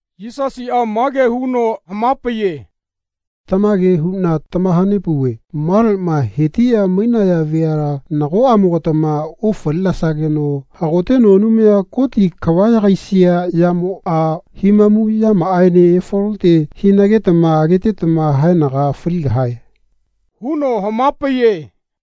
Yisasiꞌa mage huno hamapaiye “Tamage huꞌna tamahanepauve maleꞌma hetiꞌya mainaya veala nagoꞌamogatama ofalinesageno hagoteno Anumaya Koti kava yagaisia yamoꞌa himamu yamaꞌaene efalote hinagetama agetetama haenaga faligahae.” huno hamapaiye.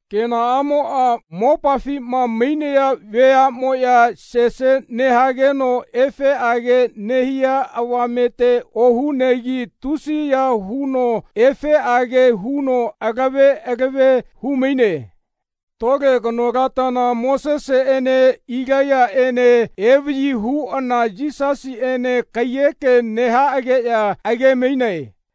Kenaꞌamoꞌa mopafima mainaya veaꞌmoꞌya sese nehageno efeꞌage nehia avamete ohunegi tusiya huno efeꞌage huno alave alave humaine. Tole kanolatana Moseseꞌene Ilaiyaꞌene evaꞌyi huꞌana Yisasiꞌene kaiyeke nehaꞌageꞌya agemainae.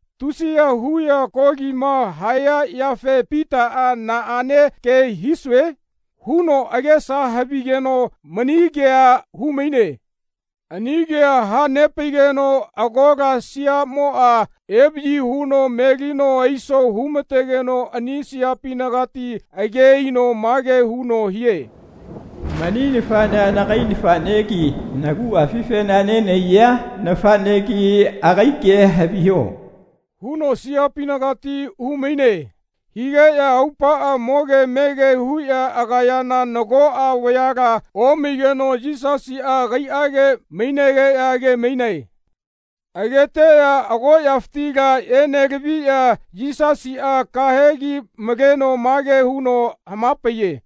Tusiya huꞌya kolima haya yafe Pitaꞌa ‘Naꞌane ke hisue?’ huno agesa havigeno mani kea humaine. Ani kea hanepaigeno agola siaꞌmoꞌa evaꞌyi huno melino aiso humategeno ani siapinagati age aino mage huno hie “Mani nafaꞌnea nagai nafaꞌnegi naguꞌafifena nenahaiya nafaꞌnegi agai kea haviho.” huno siapinagati humaine. Higeꞌya aupaꞌa moge mege huꞌya agayana nagoꞌa vayala omaigeno Yisasiꞌa agaiꞌage mainegeꞌya agemainae. Ageteꞌya agoꞌyafitila enelaviꞌya Yisasiꞌa kahegi maleno mage huno hamapaiye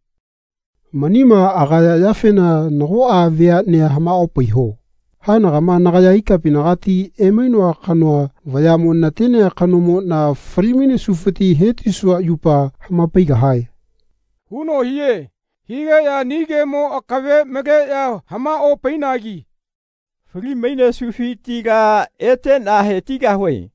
“Manima agaya yafena nagoꞌa veaꞌnea hamaꞌopaiho. Haenagama nagaya ikapinagati emainoa kanoa vayaꞌmo natenea kanomoꞌna falimainesufiti hetisua yupa hamapaigahae.” huno hie. Higeꞌya ani kemo akave maleꞌya hamaꞌopainagi “Falimainesufitila eteꞌna hetigahue.”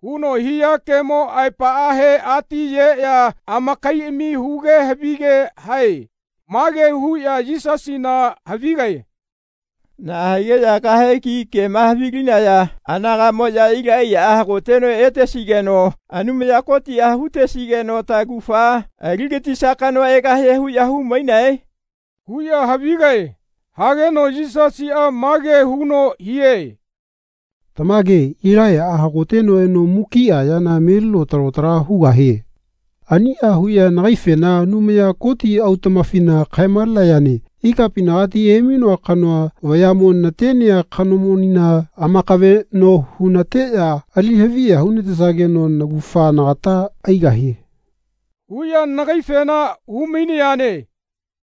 huno hia kemo aepaꞌahe atiyeꞌya amakaiꞌami huge havige hae. Mage huꞌya Yisasina havigae “Naꞌa higeꞌya kahegi kema havilinaya anagaꞌmoꞌya Ilaiyaꞌa hagoteno etesigeno Anumaya Kotiꞌa hutesigeno taugafa aligatisia kanoa egahie huꞌya humainae?” huꞌya havigae. Hageno Yisasiꞌa mage huno hie “Tamage Ilaiyaꞌa hagoteno eno mukiꞌa yana melino talo tala hugahie. Aniꞌa huꞌya nagaifena Anumaya Koti autaꞌmafina kaemalenayane “Ikapinagati emainoa kanoa vayaꞌmo natenea kanomonina amakaveꞌno hunateꞌya ali haviya hunatesageno naugafa nagata aigahie.” huꞌya nagaifena humainayane.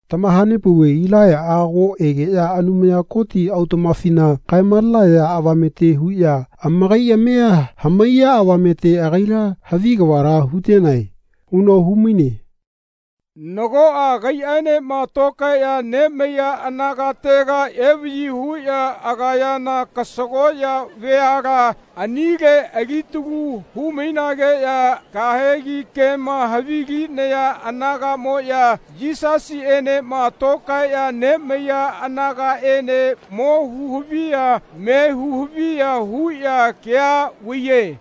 Tamahanepauve Ilaiyaꞌa ago egeꞌya Anumaya Koti autaꞌmafina kaemalenaya avamete huꞌya amakaiꞌamia hamaiya avamete agaila havi kavala hutenae.” huno humaine. Nagoꞌa agaiꞌaenema tokaeꞌya nemaiya anagatega evaꞌyi huꞌya agayana kasagoꞌya veala anile alitalu humainageꞌya kahegi kema havilinaya anagaꞌmoꞌya Yisasiꞌenema tokaeꞌya nemaiya anagaꞌene mo huhaviya me huhaviya huꞌya kea vaiye.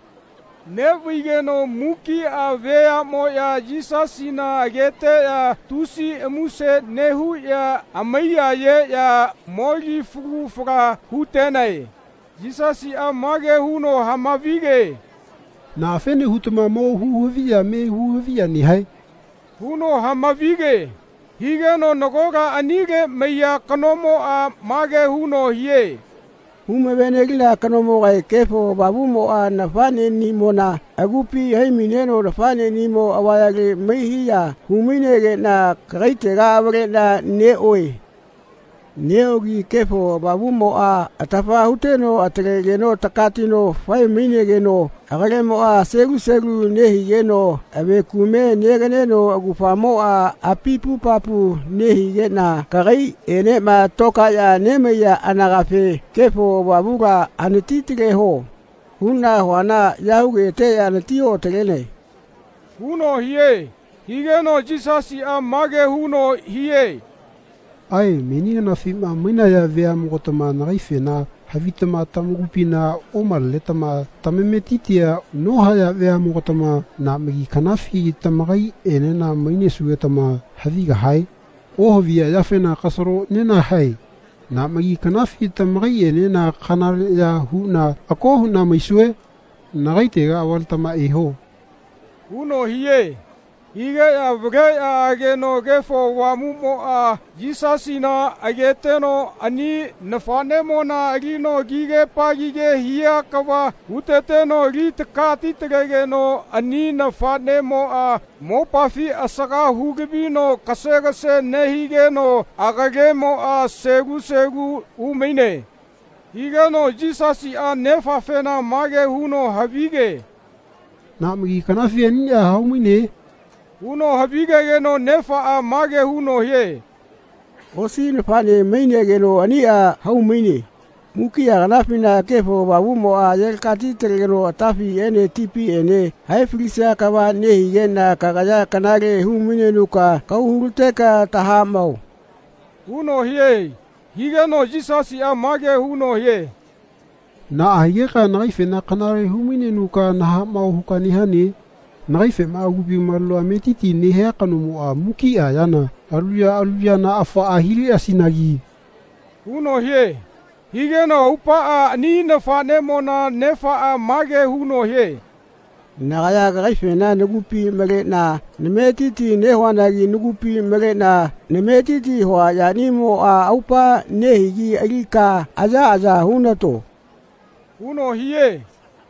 Neꞌvaigeno mukiꞌa veaꞌmoꞌya Yisasina ageteꞌya tusi muse nehuꞌya amaiyayeꞌya moli falu fala hutenae. Yisasiꞌa mage huno hamavige “Naꞌafene hutama mo huhaviya me huhaviya nehae?” huno hamavige. Higeno nagola anile maiya kanomoꞌa mage huno hie “Humavenelina kanomogae Kefo Avamuꞌmoꞌa nafaꞌneꞌnimona agupi haimaineno nafaꞌneꞌnimo avayale maihiya humainegeꞌna kagaitega avaleꞌna neꞌoe. Neꞌogi Kefo Avamuꞌmoꞌa atafa huteno atalegeno takatino faemainegeno agalemoꞌa selu selu nehigeno ave kume neganeno augafamoꞌa apipupapu nehigeꞌna kagaiꞌenema tokaeꞌya nemaiya anagafe ‘Kefo Avamula anatitaleho.’ huꞌna huana ya hugeteꞌya anatioꞌatalenae.” huno hie. Higeno Yisasiꞌa mage huno hie “Ae meni kanafima mainaya veaꞌmogatama nagaifena havitama tamakupina omalenetama tamametitia nohaya veaꞌmogatama naꞌmagi kanafi tamakaiꞌenena mainesugetama havigahae? Ohaviya yafena kasalo nenahae. Naꞌmagi kanafi tamakaiꞌenena kanaleꞌya huꞌna ako huꞌna maisue? Nagaitega avaletama eho.” huno hie. Higeꞌya avaleꞌya ageno Kefo Avamuꞌmoꞌa Yisasina ageteno ani nafaꞌnemona alino kigepagige hia kava huteteno ali takatitalegeno ani nafaꞌnemoꞌa mopafi asaga hulavino kasegase nehigeno agalemoꞌa selu selu humaine. Higeno Yisasiꞌa nefafena mage huno havige “Naꞌmagi kanafi aniꞌa haumaine?” huno havigegeno nefaꞌa mage huno hie “Osi nafaꞌne mainegeno aniꞌa haumaine. Mukiꞌa kanafina Kefo Avamuꞌmoꞌa ayelakatitalegeno atafiꞌene tipiꞌene haefalisia kava nehigeꞌna kagaya kanale humainenuka kahau hulateka tahaꞌmao.” huno hie. Higeno Yisasiꞌa mage huno hie “Naꞌa higeka nagaifena kanale humainenuka nahaꞌmao huka nehane? Nagaifema agupi maleno ametiti nehia kanomoꞌa mukiꞌa yana alu ya alu yana afaꞌa hileꞌasinagi.” huno hie. Higeno aupaꞌa ani nafaꞌnemona nefaꞌa mage huno hie “Nagaya kagaifena nagupi maleꞌna nametiti nehuanagi nagupi maleꞌna nametiti hua yanimoꞌa aupa nehigi alika ayaꞌaya hunato.” huno hie.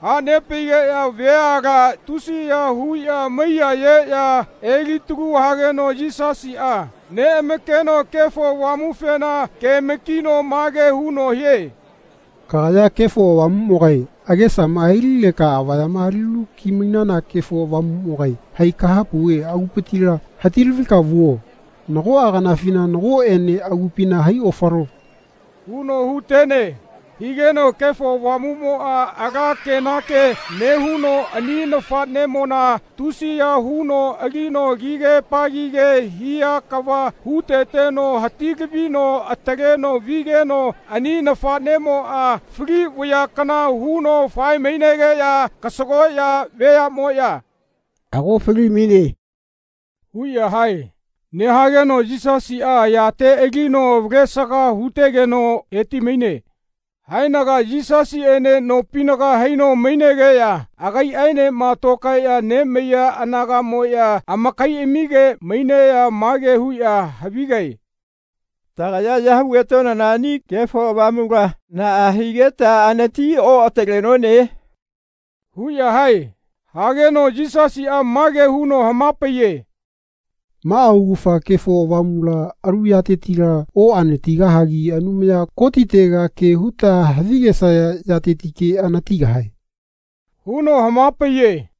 Hanepaigeꞌya veala tusiya huꞌya amaiyayeꞌya elitalu hageno Yisasiꞌa neꞌamakeno Kefo Avamufena kemakino mage huno hie “Kagaya Kefo Avamuꞌmogae agesama ailileka avaya alilu kimainana Kefo Avamuꞌmogae hai kahapauve agupitila hatilavika vuo. Nagoꞌa kanafina nagoꞌene agupina haiofalo.” huno hutene. Higeno Kefo Avamuꞌmoꞌa ala kenake nehuno ani nafaꞌnemona tusiya huno alino kigepagige hia kava huteteno hatilavino ataleno vigeno ani nafaꞌnemoꞌa fali vaya kana huno faemainegeꞌya kasagoꞌya veaꞌmoꞌya “Ago falimaine.” huꞌya hae. Nehageno Yisasiꞌa ayate alino avalesaga hutegeno hetimaine. Haenaga Yisasiꞌene nopinaga haino mainegeꞌya agaiꞌaenema tokaeꞌya nemaiya anagaꞌmoꞌya amakaiꞌamige maineꞌya mage huꞌya havigae “Tagaya ya hugetonana ani Kefo Avamula naꞌa higeta anatioꞌatalenone?” huꞌya hae. Hageno Yisasiꞌa mage huno hamapaiye “Maꞌa augafa Kefo Avamula alu yatetila oꞌanatigahagi Anumaya Kotitega ke huta havigesaya yatetike anatigahae.” huno hamapaiye.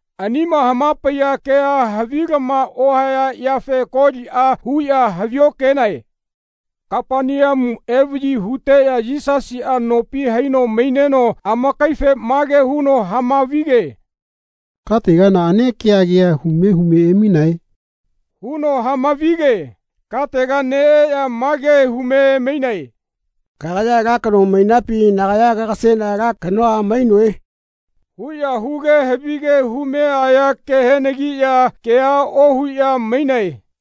Anima hamapaiya kea havilama ohaya yafe koliꞌa huꞌya haviokenae. Kapaneamu evaꞌyi huteꞌya Yisasiꞌa nopi haino maineno amakaife mage huno hamavige “Katega naꞌane kea kea hume hume emainae?” huno hamavige. Katega neꞌeꞌya ma ke hume emainae “Kagaya ala kano mainapi nagaya kagaseꞌna ala kanoa mainoe?” huꞌya huge havige hume aya kehenagiꞌya kea ohuꞌya mainae.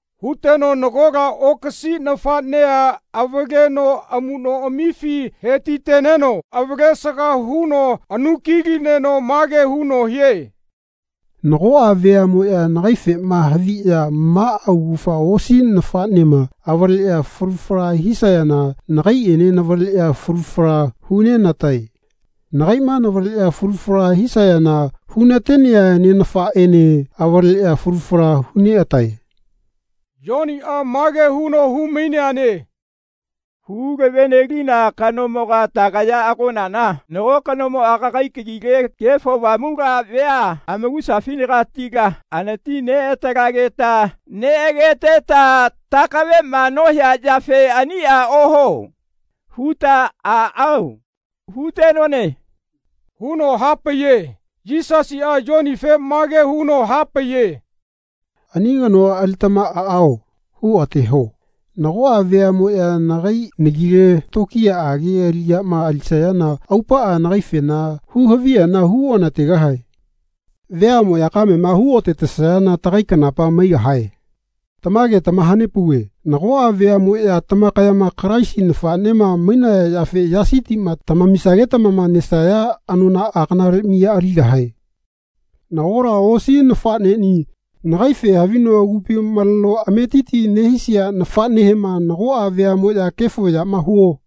Huteno nagola okasi nafaꞌnea avaleno amuꞌnoꞌamifi hetiteneno avalesaga huno anukilineno mage huno hie “Nagoꞌa veaꞌmoꞌya nagaifema haviꞌya maꞌa augafa osi nafaꞌnema avaleꞌya falu fala hisayana nagaiꞌene navaleꞌya falu fala hunenatae. Nagaiꞌma navaleꞌya falu fala hisayana hunatenea Nenafaꞌene avaleꞌya falu fala huneꞌatae.” Yoniꞌa mage huno humaineane “Hulavenelina kanomoga tagaya agonana nago kanomoꞌa kagai kagile Kefo Avamula vea amakusafinagatila anatineꞌatalegeta neꞌageteta takaveꞌma nohia yafe ‘Aniꞌa ohuo.’ huta ‘Aꞌao.’ hutenone.” huno hapaiye. Yisasiꞌa Yonife mage huno hapaiye. “Ani kanoa alitama ‘Aꞌao.’ huoꞌateho. Nagoꞌa veaꞌmoꞌya nagai nagile tokiyaꞌage aliꞌyama alisayana aupaꞌa nagaifena huhaviyana huonategahae. Veaꞌmoꞌya kamema huotatesayana tagai kanapa maigahae. Tamage tamahanepauve nagoꞌa veaꞌmoꞌya tamakayama Kalaisi nafaꞌnema mainaya yafe yasi tima tamamisagetama nesayana anonaꞌa kanale miya aligahae.” “Nagola osi nafaꞌneꞌni, nagaife havino agupi maleno ametiti nehisia nafaꞌnehema nagoꞌa veaꞌmoꞌya ‘Kefo yama huo.’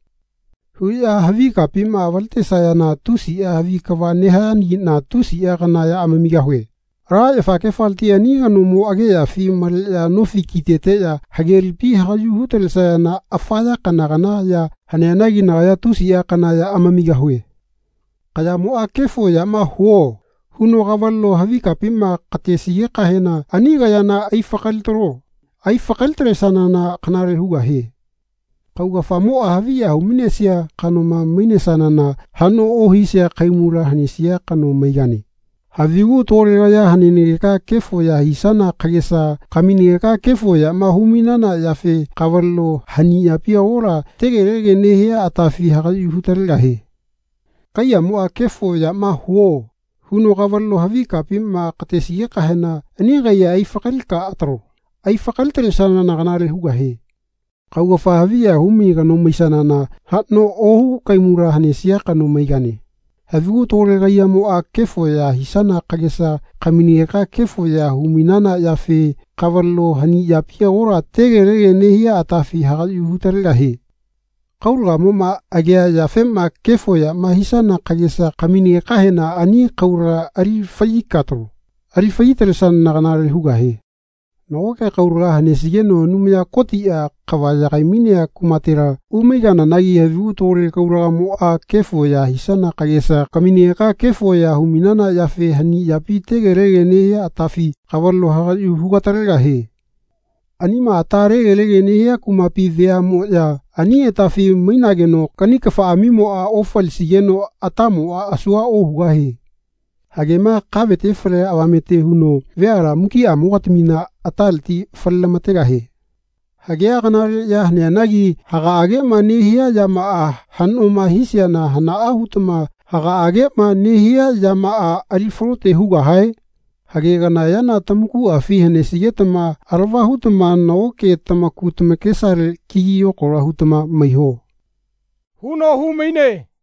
huꞌya havi kapima avaletesayana tusiꞌa havi kava nehayanagiꞌna tusiꞌa kana ya amamigahue. Ala yafagefaleti ani kanomo ageꞌyafi maleꞌya nofi kiteteꞌya hage lipi hagaꞌyu hutalesayana afa ya kana kana ya haneanagi nagaya tusiꞌa kana ya amamigahue. Kayamoꞌa ‘Kefo yama huo.’ huno kavaleno havi kapima katesigekahena ani kayana aifakalitalo. Aifakalitalesanana kanale hugahie. Kaugafamoꞌa haviya humainesia kanoma maisanana haꞌno ohisia kahaimula hanesia kano maigane. Havigu tole kaya hanenageka kefo ya hisana kagesa kaminegeka kefo yama humainana yafe kavaleno hani yapi agola tegelege nehia atafi hagaꞌyu hugatalegahie. Kaiyamoꞌa ‘Kefo yama huo.’ huno kavaleno havi kapima katesigekahena ani kaiya aifakalika atalo. Aifakalitalesanana kanale hugahie. Kaugafa haviya humai kano maisanana haꞌno ohu kahaimula hanesia kano maigane. Havigu tole kaiyamoꞌa kefo ya hisana kagesa kaminegeka kefo ya humainana yafe kavaleno hani yapi agola tegelege nehia atafi hagaꞌyu hugatalegahie. Kaulagamoꞌma agea yafema kefo yama hisana kagesa kaminagekahena ani kaulaga ali faꞌyika atalo. Ali faꞌyitalesanana kanale hugahie. Nagoke kaulaga hanesigeno Anumaya Kotiꞌa kava yagaimainea kumatela umaigananagi havigu tole kaulagamoꞌa kefo ya hisana kagesa kaminegeka kefo ya humainana yafe hani yapi tegelege nehia atafi kavaleno hagaꞌyu hugatalegahie. Anima ata legelege nehia kumapi veaꞌmoꞌya ani atafi mainageno kani kafaꞌamimoꞌa ofalisigeno atamoꞌa asua ohugahie. Hagema kavete falea avamete huno veala mukiꞌamogatamina ataleti falelamategahie. Hagea kanale ya haneanagi hagaꞌageꞌma nehia yamaꞌa haꞌnoma hisiana hanaꞌa hutama hagaꞌageꞌma nehia yamaꞌa ali falote hugahae? Hage kana yana tamakuꞌafi hanesigetama alava hutama nagoke tamaku tamakesale kigi yokalo hutama maiho.” huno humaine.